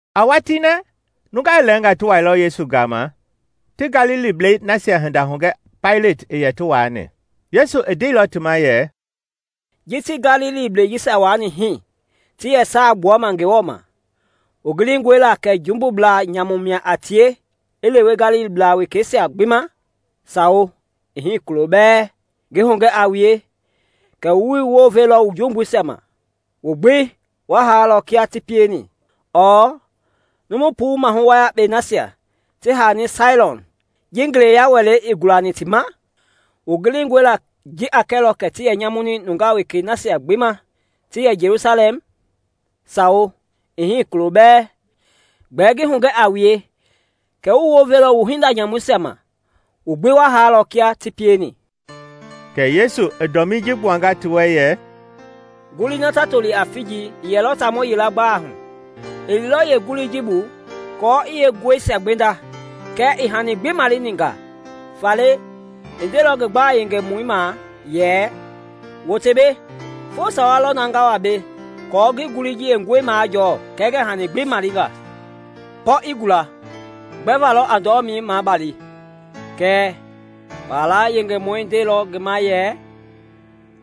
A watii na nungaa lɛɛnga ti wailɔ Yesu gama ti Galiliblɛi nasia hinda hugɛ Paileti i yɛ ti waani. Yesu i ndeilɔ ti ma yɛ, “Ji ti Galiliblɛi jisia wani hii ti yɛ saai gbuama Ngewɔ ma, wu gilingɔe la kɛ jumbubla nyamu mia a tie i lewe Galilibla wekeisia gbi ma? Sawo, ii hii kulo bɛɛ! Ngi hugɛ a wue kɛ wuii wounveilɔ wu jumbuisia ma, wu gbi wa haalɔ kia ti pieni. Ɔɔ numu puu mahu wayakpei nasia ti haani Sailoam ji ngeleya wɛlei i gulani ti ma? Wu gilingɔe la ji a kɛlɔ kɛ ti yɛ nyamuni nungaa wekei nasia gbi ma ti yɛ Jelusalɛm? Sawo, ii hii kulo bɛɛ! Gbɛɛ ngi hugɛ a wue kɛ wuii wounveilɔ wu hinda nyamuisia ma, wu gbi wa haalɔ kia ti pieni.” Kɛ Yesu i dɔmii ji gbuanga ti wɛ yɛ, “Ngulii na ta toli a figi i yɛlɔ taamɔ yila gbalei hu. I liilɔ yee ngulii ji bu aako i yeenguɛisia gbenda kɛɛ ii hani gbi maleni nga. Faale i ndeilɔ ngi gbala yengemɔi ma yɛ, ‘Wote mbei, foo sawa lɔ na nga wa mbei aako ngi ngulii ji yeenguɛi majɔɔ kɛɛ ngɛɛ hani gbi male nga. Pɔ i gula! Gbɛva lɔ a ndɔlɔmei mabali?’ Kɛɛ, kpala yengemɔi ndeilɔ ngi ma yɛ,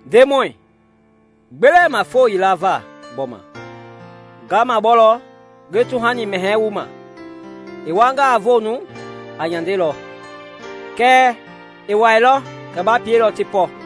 ‘Ndemɔi, gbe lɛɛ ma foo yila va gbɔma; nga mabɔlɔ, ngi tuhani mɛhɛɛ wu ma. I wuangaa voonu, a nyandelɔ; kɛɛ, ii wailɔ, kɛ ba pielɔ ti pɔ.’”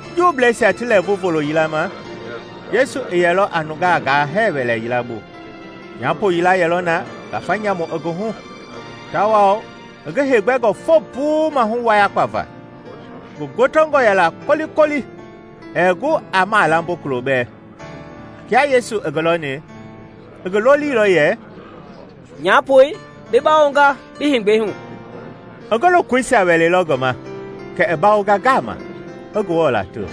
Juubleisia ti lɛɛvu volo yila ma Yesu i yɛlɔ a nungaa gaa hɛɛ wɛlɛ yila bu. Nyapo yila yɛlɔ na ngafa nyamu i ngi hu; tawao i ngi heegbɛngɔ foo puu mahu wayakpa va; ngi gotongɔ yɛla kolikoli, ɛɛ gu aa malambo kulobɛɛ. Kia Yesu i ngi lɔni, i ngi lolilɔ yɛ, “Nyapoi, bi bawonga bi heegbɛi hu!” I ngi lokoisia wɛleilɔ ngi ma kɛ i bawonga ngama, i Ngewɔ lato.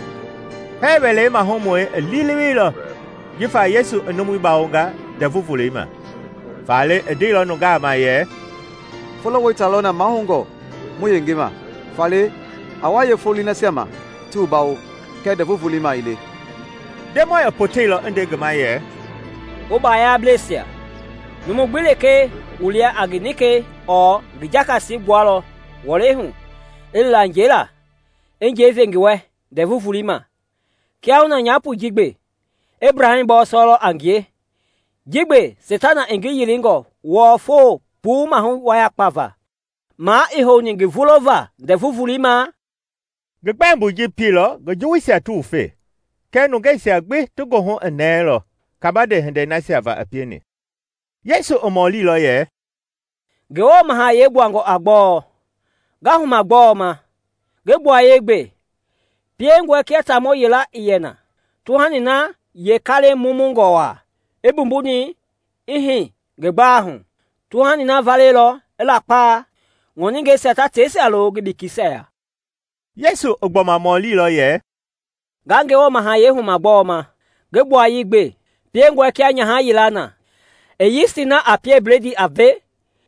Hɛɛ wɛlei mahumɔi i liileweilɔ jifa Yesu i numui bawonga Ndɛvu Volei ma, faale i ndeilɔ nungaa ma yɛ “Folo wɛita lɔ na mahoungɔ mu yenge ma; faale a wa yee foloi nasia ma ti wu bawo, kɛɛ Ndɛvu Volei ma ii le!” Ndemɔi i poteilɔ i nde ngi ma yɛ, “Wu bayablɛsia! Numu gbi lekee wu lia a ngi nikɛi ɔɔ ngi jakasi gbualɔ wɔlɛi hu i li la njɛi la, i njɛi ve ngi wɛ Ndɛvu Volei ma. Kiahuna nyapoi ji gbe, Ebraham bɔɔsɔɛi a ngie, ji gbe, Seitana i ngi yilinga wɔɔ foo puu mahu wayakpa va; ma ii houni ngi vulova Ndɛvu Volei ma?” Ngi gbɛmboi ji pieilɔ ngi juwuisia ti wufe, kɛɛ nungeisia gbi ti goohu i nɛɛlɔ kabande hindei nasia va i pieni. Yesu i mɔlilɔ yɛ, “Ngewɔ Mahayɛi gbuangɔ a gbɔɔ? Nga huma gbɔɔ ma? Ngi gbuayei gbe: piengɔe kia taamɔ yila i yɛ na, tuhani na yee kalɛi mumungɔ wa, i mbumbuni i hii ngi gbalei hu. Tuhani na valeilɔ, i lakpa, ŋɔningɛisia ta teisia lo ngi bekeisia ya.” Yesu i gbɔma mɔlilɔ yɛ, “Nga Ngewɔ Mahayɛi huma gbɔɔ ma? Ngi gbuayei gbe: piengɔe kia nyaha yila na, i yisti na a pie bledii a ve,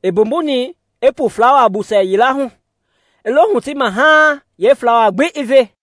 i mbumbuni i pu flawaa busɛ yila hu, i lo hutima haaŋ yee flawai gbi i ve.”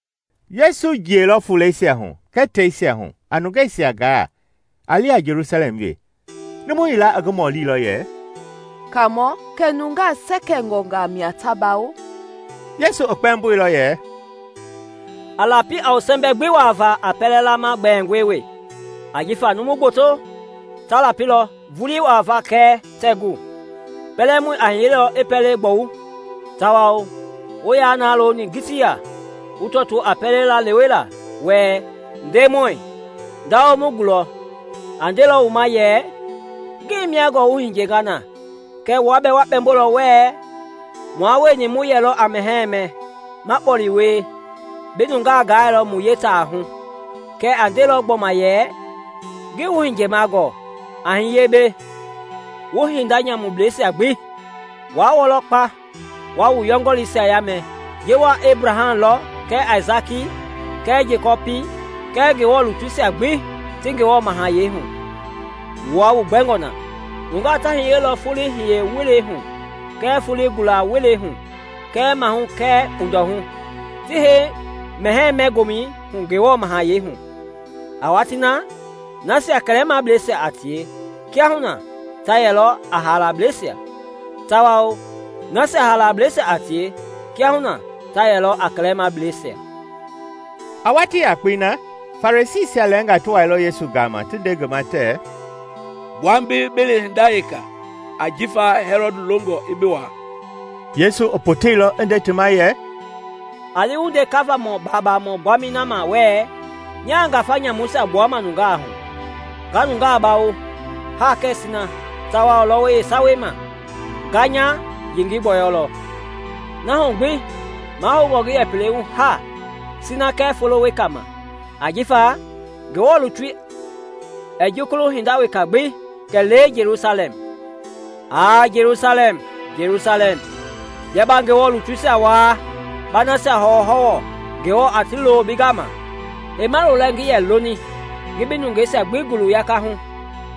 Yesu jiɛilɔ fuleisia hu kɛɛ teisia hu a nungeisia gaa, a li a Jelusalɛm wee. Numu yila i ngi mɔlilɔ yɛ, “Kaamɔ, kɛ nungaa sɛkɛngɔ mia ta bawo?” Yesu i kpɛmboilɔ yɛ, “A lapi a wu sɛmbɛi gbi wuavaa a pɛlɛ lama gbɛɛngɔi wee; ajifa numu gboto ta lapilɔ vulii wuavaa kɛɛ tɛɛ gu. Pɛlɛmɔi a hiyelɔ i pɛlei gbɔwu, tawao wu ya na looni ngitiya wu tɔtoo a pɛlei lalewela wɛ, ‘Ndemɔi, ndawo mu gulɔ,’ a ndelɔ wu ma yɛ, ‘Ngii mia gɔɔ wu hiyenga na!’ Kɛ wua bɛɛ wu kpɛmbonga wɛɛ, ‘Mua wueni mu yɛlɔ a mɛhɛɛ mɛ, ma kpɔle wie; bi nungaa gailɔ mu yee taahu!’ Kɛɛ a ndelɔ gbɔma yɛ, ‘Ngii wu hiyema gɔɔ. A hiye mbɛ, wu hinda nyamublɛisia gbi!’ Wa wɔlɔ kpa, wa wu yɔngɔliisia yamɛ ji wa Ebraham lɔ kɛɛ Aisaki kɛɛ Jekɔpi kɛɛ Ngewɔ lutuisia gbi ti Ngewɔ Mahayɛi hu; wua wu gbɛngɔ na! Nungaa ta hiyelɔ foloi hiye welei hu kɛɛ foloi gula- welei hu kɛɛ maahu kɛɛ kpundɔhu, ti hei mɛhɛɛ-mɛ-gomɛi hu Ngewɔ mahayɛi hu. A watii na, nasia kɛlɛmableisia a tie kiahuna ta yɛlɔ a haalableisia, tawao nasia haalableisia a tie kiahuna ta yɛlɔ a kɛlɛmableisia.” A watii yakpei na, Farisiisia lɛɛnga ti wailɔ Yesu gama ti nde ngi ma tɛɛ, “Gbua mbei bi li hinda weka ajifa Hɛlɔd longɔ i bi waa.” Yesu i poteilɔ i nde ti ma yɛ, “A li wu nde kavamɔ babaamɔ gbami na ma wɛɛ, ‘Nya ngafa nyamuisia gbuama nungaa hu, nga nungaa bawo, ha kɛɛ sina, tawao lɔwɔi yeesawei ma nga nya yengei gbɔyɔlɔ.’ Na hu gbi mahoungɔ ngi yɛ pelei hu haa, sina kɛɛ folo wekei ma; ajifa Ngewɔ lutui ɛɛ jukulu hinda weka gbi, kɛlee Jelusalɛm. “Aa Jelusalɛm, Jelusalɛm! Bia ba Ngewɔ lutuisia waa, ba nasia hɔwɔhɔwɔ Ngewɔ a ti lo bi gama! Heima lolɛ ngi yɛ loni ngi bi nungeisia gbi gulu yakahu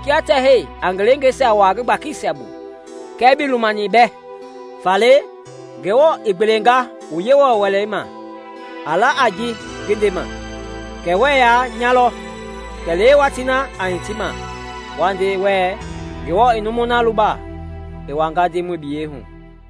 kia tɛhɛi a ngi leengeisia wua ngi gbakisia bu, kɛɛ bii lumani mbɛ! Faale Ngewɔ i gbelenga wu Yewɔ Wɛlei ma. A la a ji ngi ndema, kɛ wuɛ ya nya lɔ; kɛlee watii na a hitima wa nde wɛɛ, ‘Ngewɔ i numui na luba i wama Ndemɔi biyei hu.’”